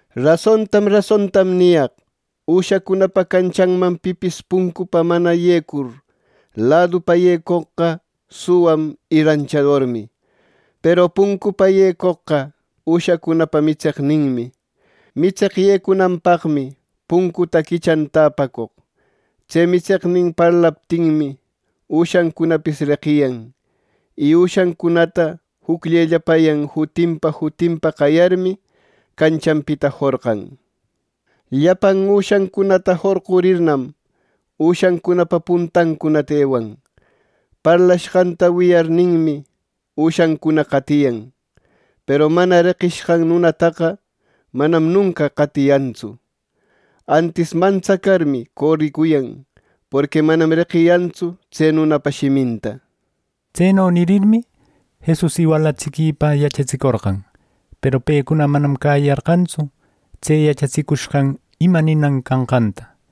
“Rasontam rasontam niyaq: Üshacunapa canchanman pipis puncunpa mana yecur, ladupa yecoqqa suwam y ranchadormi. Peru puncunpa yecoqqa üshacunapa mitseqninmi. Mitseq yecunanpaqmi puncuta quichan täpacoq. Tse mitseqnin parlaptinmi, üshancunapis reqiyan; y üshancunata jucllellapayan jutinpa jutinpa qayarmi, canchanpita jorqan. Llapan üshancunata jorqurirnam, üshancunapa puntancunata ewan. Parlashqanta wiyarninmi, üshancuna qatiyan. Peru mana reqishqan nunataqa manam nunca qatiyantsu. Antis mantsacarmi, coricuyan; porqui manam reqiyantsu tse nunapa shiminta” nir. Tseno nirmi, Jesus iwalatsiquipa yachatsicorqan. Peru pecuna manam cäyiyarqantsu tse yachatsicushqan ima ninan canqanta.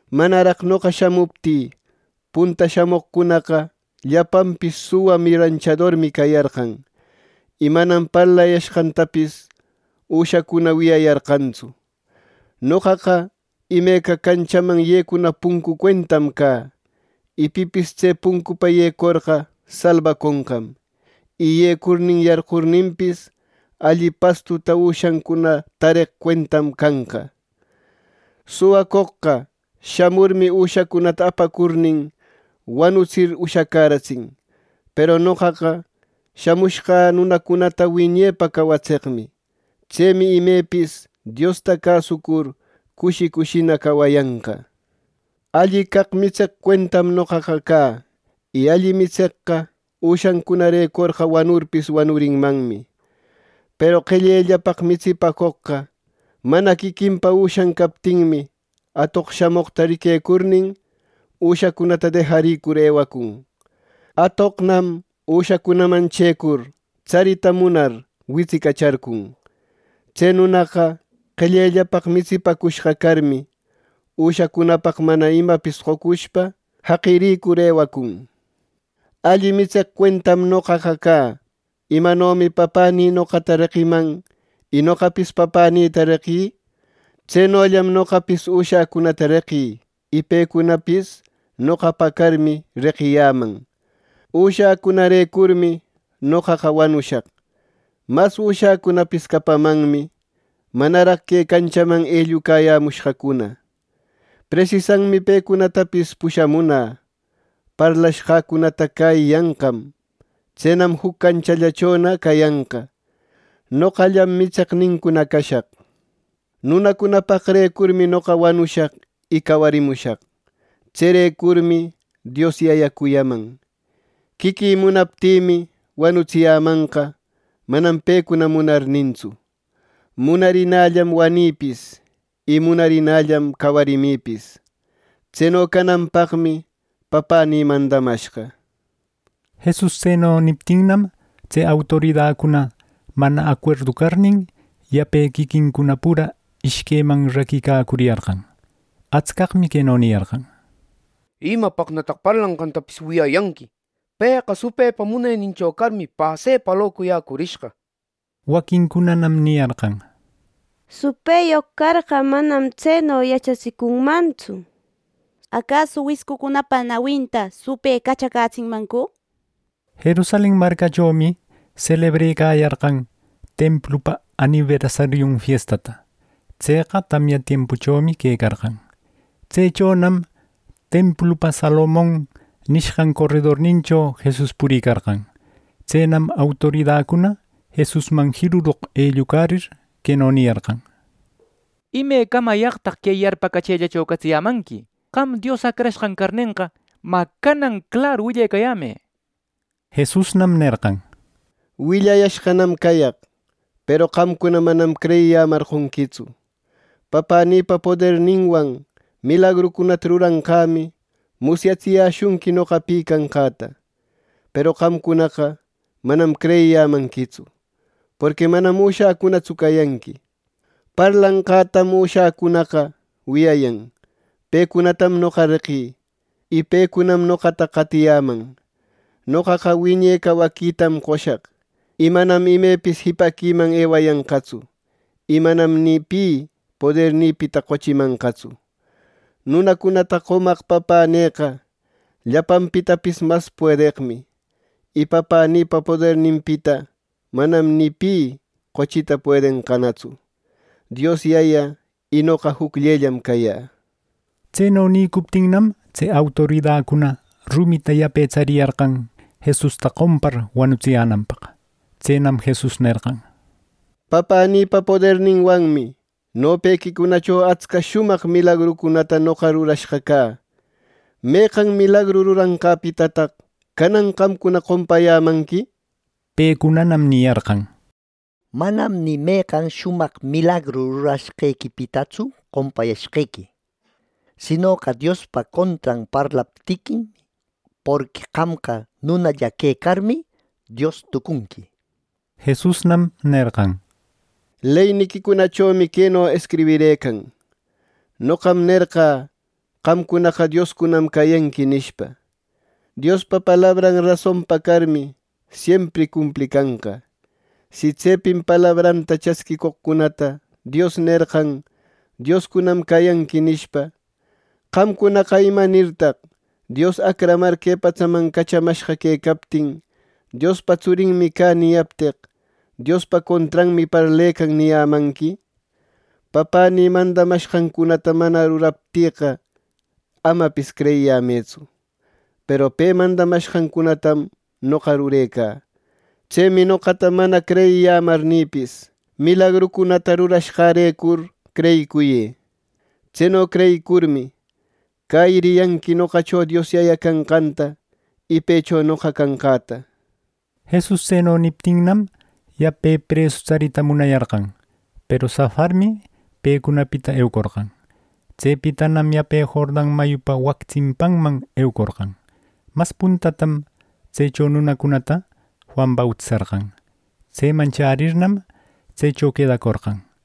Manaraq noqa shamuptï punta shamoqcunaqa llapanpis suwan y ranchadormi cayarqan; y manam parlayashqantapis üshacuna wiyayarqantsu. Noqaqa imeca canchaman yecuna puncu cuentam cä; y pipis tse puncupa yecorqa salbaconqam. Y yecurnin yarqurirninpis, alli pastuta üshacuna tareq cuentam canqa. “Suwacoqqa shamurmi, üshacunata apacurnin wanutsir ushacäratsin; peru noqaqa shamushqä nunacunata wiñepa cawatseqmi. Tsemi imepis Diosta cäsucur, cushi cushina cawayanqa. Alli caq mitseq cuentam noqaqa cä. Y alli mitseqqa üshancunarecorqa wanurpis wanurinmanmi. Peru qellellapaq mitsipäcoqqa mana quiquinpa üshan captinmi, atoq shamoqta riquecurnin, üshacunata dejarïcur ewacun. Atoqnam üshacunaman chëcur tsarita munar, witsicacharcun. Tse nunaqa qellellapaq mitsipäcushqa carmi, üshacunapaq mana imapis qocushpa jaqiricur ewacun. “Alli mitseq cuentam noqaqa cä. Imanomi Papänï noqata reqiman y noqapis Papänïta reqï, tsenollam noqapis üshäcunata reqï; y pecunapis noqapa carmi, reqiyäman. Üshäcunarecurmi noqaqa wanushaq. Mas üshäcunapis capamanmi manaraq que canchaman ellucayämushqacuna; presisanmi pecunatapis pushamunä. Parlashqäcunata cäyiyanqam. Tsenam juc canchallachona cayanqa; noqallam mitseqnincuna cashaq. “Nunacunapaqrecurmi noqa wanushaq y cawarimushaq. Tserecurmi Dios Yaya cuyaman. Quiquï munaptïmi, wanutsiyämanqa, manam pecuna munarnintsu. Munarinällam wanïpis, y munarinällam cawarimipis. Tseno cananpaqmi Papänï mandamashqa” nir. Jesus tseno niptinnam, tse autoridacuna mana acuerdu carnin, yape quiquincuna pura ishqueman raquicacuriyarqan. Atscaqmi queno niyarqan: —¿Imapaqnataq parlanqantapis wiyayanqui? Pëqa supëpa munenincho carmi, pasepa locuyäcurishqa —nir. Waquincunanam niyarqan: —Supëyoq carqa, manam tseno yachatsicunmantsu. ¿Acasu wiscucunapa nawinta supë cachacätsinmancu? —nir. Jerusalen marcachomi selebrecayarqan Templupa aniversariun fiestata. Tseqa tamya tiempuchomi quecarqan. Tsechonam templupa Salomon nishqan coredornincho Jesus puricarqan. Tsenam autoridacuna Jesusman jiruroq ellucarir, queno niyarqan: —¿Imecamayaqtaq que yarpacachëllacho catsiyämanqui? Qam Dios Acrashqan carnenqa, mä canan claru willecayämë —nir. Jesusnam nerqan: —Willayashqanam cayaq, peru qamcuna manam creyiyämarqonquitsu. Papänïpa poderninwan milagrucunata ruranqämi musyatsiyäshunqui noqa pi canqäta. Peru qamcunaqa manam creyiyämanquitsu, porqui manam üshäcunatsu cayanqui. Parlanqätam üshäcunaqa wiyayan. Pecunatam noqa reqï, y pecunam noqata qatiyäman. Noqaqa wiñe cawaquitam qoshaq, y manam imepis jipaquiman ewayanqatsu, y manam ni pi podernïpita qochimanqatsu. Nunacunata qomaq Papänïqa llapanpitapis mas puedeqmi. Y Papänïpa poderninpita manam ni pi qochita puedenqanatsu. Dios Yaya y noqa jucllellam cayä —nir. Tseno nicuptinnam, tse autoridacuna rumita yape tsariyarqan Jesusta qompar wanutsiyänanpaq. Tsenam Jesus nerqan: —Papänïpa poderninwanmi nopequicunacho atsca shumaq milagrucunäta noqa rurashqa cä. ¿Meqan milagru ruranqäpitataq canan qamcuna qompayämanqui? —nir. Pecunanam niyarqan: —Manam ni meqan shumaq milagru rurashqequipitatsu qompayashqequi; sinoqa Diospa contran parlaptiquim, porqui qamqa nunalla quecarmi, ¡Dios tucunqui! —nir. Jesusnam nerqan: —Leyniquicunachomi queno escribirëcan: ‘Noqam nerqä qamcunaqa dioscunam cayanqui’ nishpa. (Diospa palabranqa rasonpa carmi siempri cumplicanqa.) Si tsepin palabranta chasquicoqcunata Dios nerqan ‘dioscunam cayanqui’ nishpa, qamcunaqa, ¿imanirtaq Dios acramar que patsaman cachamashqa quecaptin ‘Diospa tsurinmi cä’ niyapteq, ‘Diospa contranmi parlecan’ niyämanqui? Papänï mandamashqancunata mana ruraptïqa, amapis creyiyämëtsu, peru pe mandamashqancunatam noqa rurecä. Tsemi noqata mana creyiyämarnïpis, milagrucunata rurashqärecur creyicuyë. Tseno creyicurmi, cäyiriyanqui noqacho Dios Yayä canqanta y pëcho noqa canqäta —nir. Jesus tseno niptinnam, yape presu tsarita munayarqan, peru safarmi pecunapita eucorqan. Tsepitanam yape Jordan mayupa wac tsimpanman eucorqan. Mas puntatam tsecho nunacunata Juan bautisarqan. Tseman chärirnam, tsecho quedacorqan.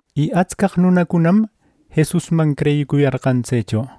Y atscaq nunacunam Jesusman creyicuyarqan tsecho.